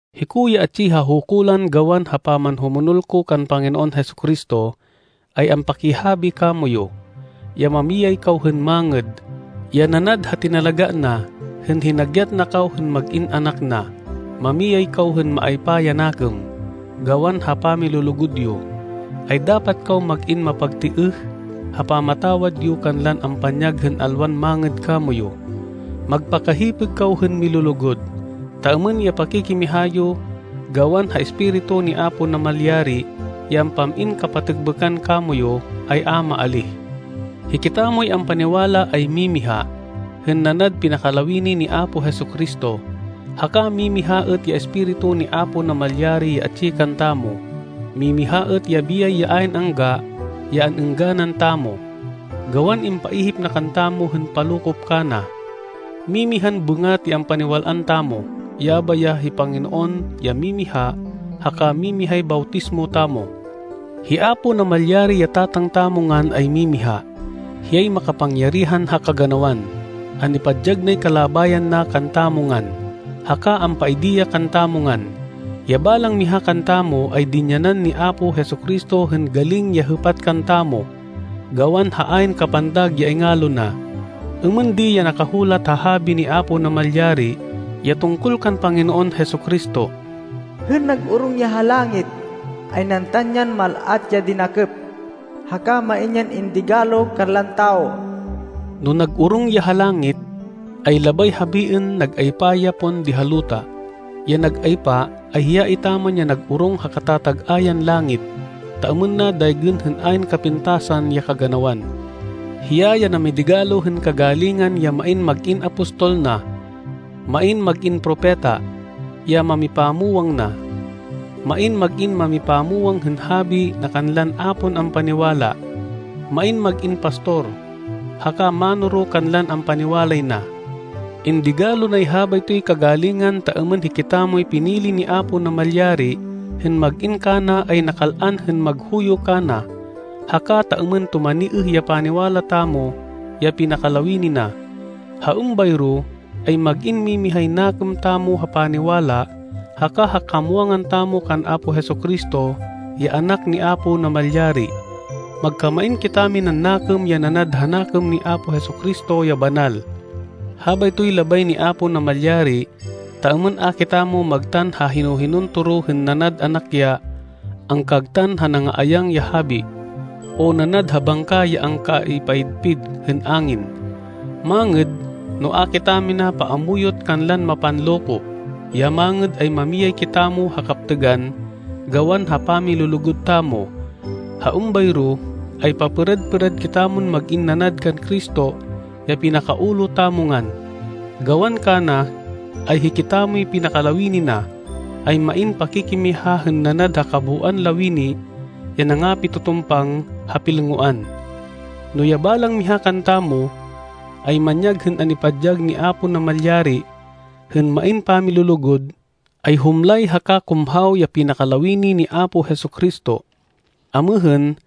Hiko ya atsi ha hukulan gawan ha pamanhumonol ko kan Panginoon Jesu-Cristo, ay ampakihabi kamoyu, ya mamiyay kaw hên mangêd, ya nanad ha tinalagá na hên hinagyat na kaw hên mag-in anak na. Mamiyay kaw hên maaypa ya nakêm. Gawan ha pamilulugud yo, ay dapat kaw mag-in mapagtêêh ha pamatawad yo kanlan ampanyag hên alwan mangêd kamoyu. Magpakahipêg kaw hên milulugud, ta êmên ya pakikimiha yo gawan ha Espiritu ni Apo Namalyari ya ampam-in kapatêkbêkan kamoyu, ay a maalíh. Hikitamoy ampaniwala ay mimiha, hên nanad pinakalawini ni Apo Jesu-Cristo. Haka mimiha êt ya Espiritu ni Apo Namalyari ya atsi kantamo. Mimiha êt ya biyay ya ayn angga ya an-êngganan tamo, gawan impaihip na kantamo hên palokop kana. Mimihan bêngat ya ampaniwal-an tamo. Yabay ya hi Panginoon ya mimiha haka mimihay bawtismo tamo. Hi Apo Namalyari ya Tatang tamo ngan ay mimiha. Hiyay makapangyarihan ha kaganawan. An-ipadyag nay kalabayan na kantamo ngan, haka ampaidi ya kantamo ngan. Ya balang miha kantamo ay dinyanan ni Apo Jesu-Cristo hên galing ya hêpat kantamo, gawan ha ayn kapantag ya ingalo na. Êmên di ya nakahulat ha Habi ni Apo Namalyari ya tungkol kan Panginoon Jesu-Cristo, “Hên nag-orong ya ha langit, ay nantan yan mal-at ya dinakêp, haka main yan indigalo kanlan tawo.” No nag-orong ya ha langit, ay labay habiên nag-aypa ya pon di ha luta. Ya nag-aypa, ay hiya etaman ya nag-orong ha katatag-ayan langit, ta êmên na daygên hên ayn kapintasan ya kaganawan. Hiya ya namidigalo hên kagalingan ya main mag-in apostol na, main mag-in propeta, ya mámipamwang na, main mag-in mamipamwang hên habi na kanlan a pon ampaniwala, main mag-in pastor haka mánoro kanlan ampaniwalay na. Indigalo nay habaytoy kagalingan ta êmên hikitamoy pinili ni Apo Namalyari hên mag-in kana ay nakal-an hên maghuyo kana, haka ta êmên tumaniêh ya paniwala tamo ya pinakalawini na. Ha êmbayro ay mag-in mimihay nakêm tamo ha paniwala haka ha kamwangan tamo kan Apo Jesu-Cristo ya Anak ni Apo Namalyari. Magkamain kitaminan nakêm ya nanad ha nakêm ni Apo Jesu-Cristo ya banal. Habaytoy labay ni Apo Namalyari ta êmên a kitamo magtan ha hino-hinon toro hên nanad anak ya angkagtan ha nanga-ayang ya habi, o nanad ha bangka ya angkaipayidpid hên angin. Mangêd no a kitamina paamuyot kanlan mapanloko. Ya mangêd ay mamiyay kitamo ha kaptêgan gawan ha pamilulugud tamo. Ha êmbayro ay papêrad-pêrad kitamon mag-in nanad kan Cristo ya pinaka-ulo tamo ngan. Gawan kana, ay hikitamoy pinakalawini na, ay main pakikimiha hên nanad ha kabooan lawini ya nangapitutumpang ha pilngoan. No ya balang miha kantamo ay manyag hên an-ipadyag ni Apo Namalyari hên main pamilulugud, ay humlay haka kumhaw ya pinakalawini ni Apo Jesu-Cristo. Amêhên,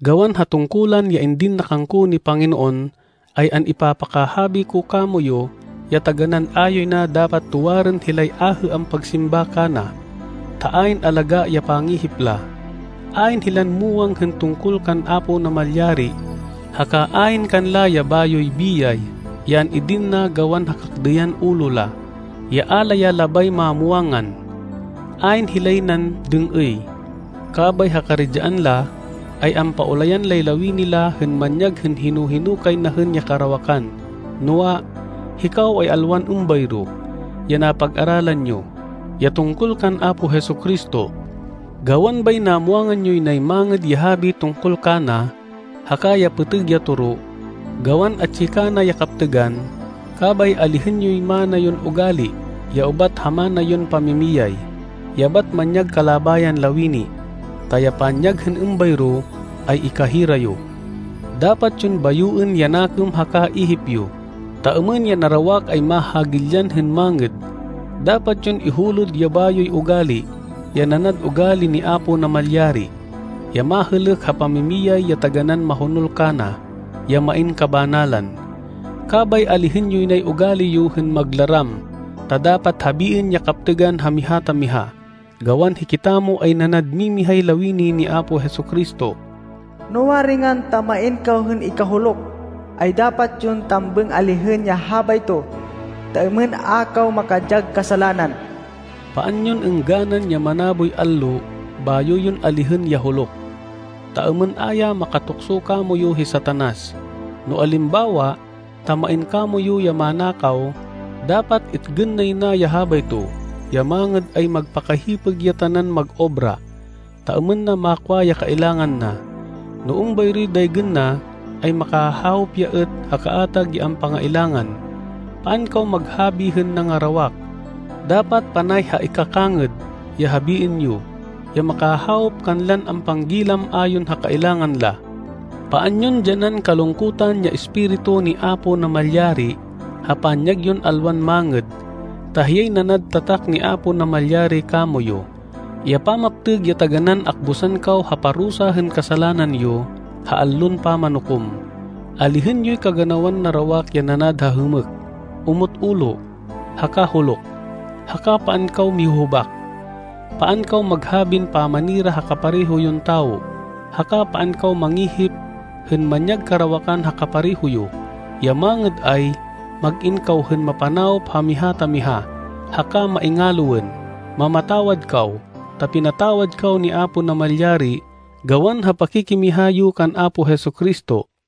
gawan ha tungkulan ya indin na kangko ni Panginoon ay an-ipapakahabi ko kamoyu ya taganán a yoy na dapat tuwarên hilay ahê ampagsimba kana, ta ayn alagá ya pangihip la. Ayn hilan muwang hên tungkol kan Apo Namalyari, haka ayn kanla ya bayoy biyay ya an-idin na gawan ha kakdêyan ulo la, ya a la ya labay mamwangan. Ayn hilay nan dêng-êy, kabay ha karidyaan la, ay ampaulayan lay lawini la hên manyag hên hino-hino kay na hên ya karawakan. Noa, hikaw ay alwan êmbayro ya napag-aralan yo, ya tungkol kan Apo Jesu-Cristo! Gawan bay namwangan yoy nay Mangêd ya Habi tungkol kana, haka ya pêtêg ya toro, gawan atsi kana ya kaptêgan. Kabay alihên yoy mana yon ugali, ya ubat ha mana yon pamimiyay, ya bat manyag kalabayan lawini, ta ya panyag hên êmbayro ay ikahira yo. Dapat yon bayoên ya nakêm haka ihip yo, ta êmên ya narawak ay mahagilyan hên mangêd. Dapat yon ihulod ya bayoy ugali, ya nanad ugali ni Apo Namalyari, ya mahêlêk ha pamimiyay ya taganán mahonol kana, ya main kabanalan. Kabay alihên yoy nay ugali yo hên maglaram ta dapat habiên ya kaptêgan ha miha ta miha, gawan hikitamo ay nanad mimihay lawini ni Apo Jesu-Cristo. No waringan ta main kaw hên ikahuluk, ay dapat yon tambêng alihên ya habayto, ta êmên a kaw makadyag kasalanan. Paan yon êngganan ya manaboy allo bayo yon alihên ya huluk, ta êmên a ya makatukso kamoyu hi Satanas. No alimbawa ta main kamoyu ya manakaw, dapat itgên nay na ya habayto. Ya mangêd ay magpakahipêg ya tanan mag-obra, ta êmên na makwa ya kailangan na. No êmbayroy daygên na, ay makahawop ya êt ha kaatag ya ampangailangan. Paan kaw maghabi hên nangarawak. Dapat panay ha ikakangêd ya habiên yo, ya makahawop kanlan ampanggilam ayon ha kailangan la. Paan yon dyanan kalungkutan ya Espiritu ni Apo Namalyari ha panyag yon alwan mangêd, ta hiyay nanad tatak ni Apo Namalyari kamoyu, ya pamaptêg ya taganán akbusan kaw ha parusa hên kasalanan yo ha Allon Pamanukom. Alihên yoy kaganawan narawak ya nanad ha hêmêk, omot ulo, haka huluk. Haka paan kaw mihuhubak. Paan kaw maghabin pamanira ha kapareho yon tawo. Haka paan kaw mangihip hên manyag karawakan ha kapareho yo. Ya mangêd ay, mag-in kaw hên mapanawop ha miha ta miha, haka maingaloên. Mamatawad kaw, ta pinatawad kaw ni Apo Namalyari gawan ha pakikimiha yo kan Apo Jesu-Cristo.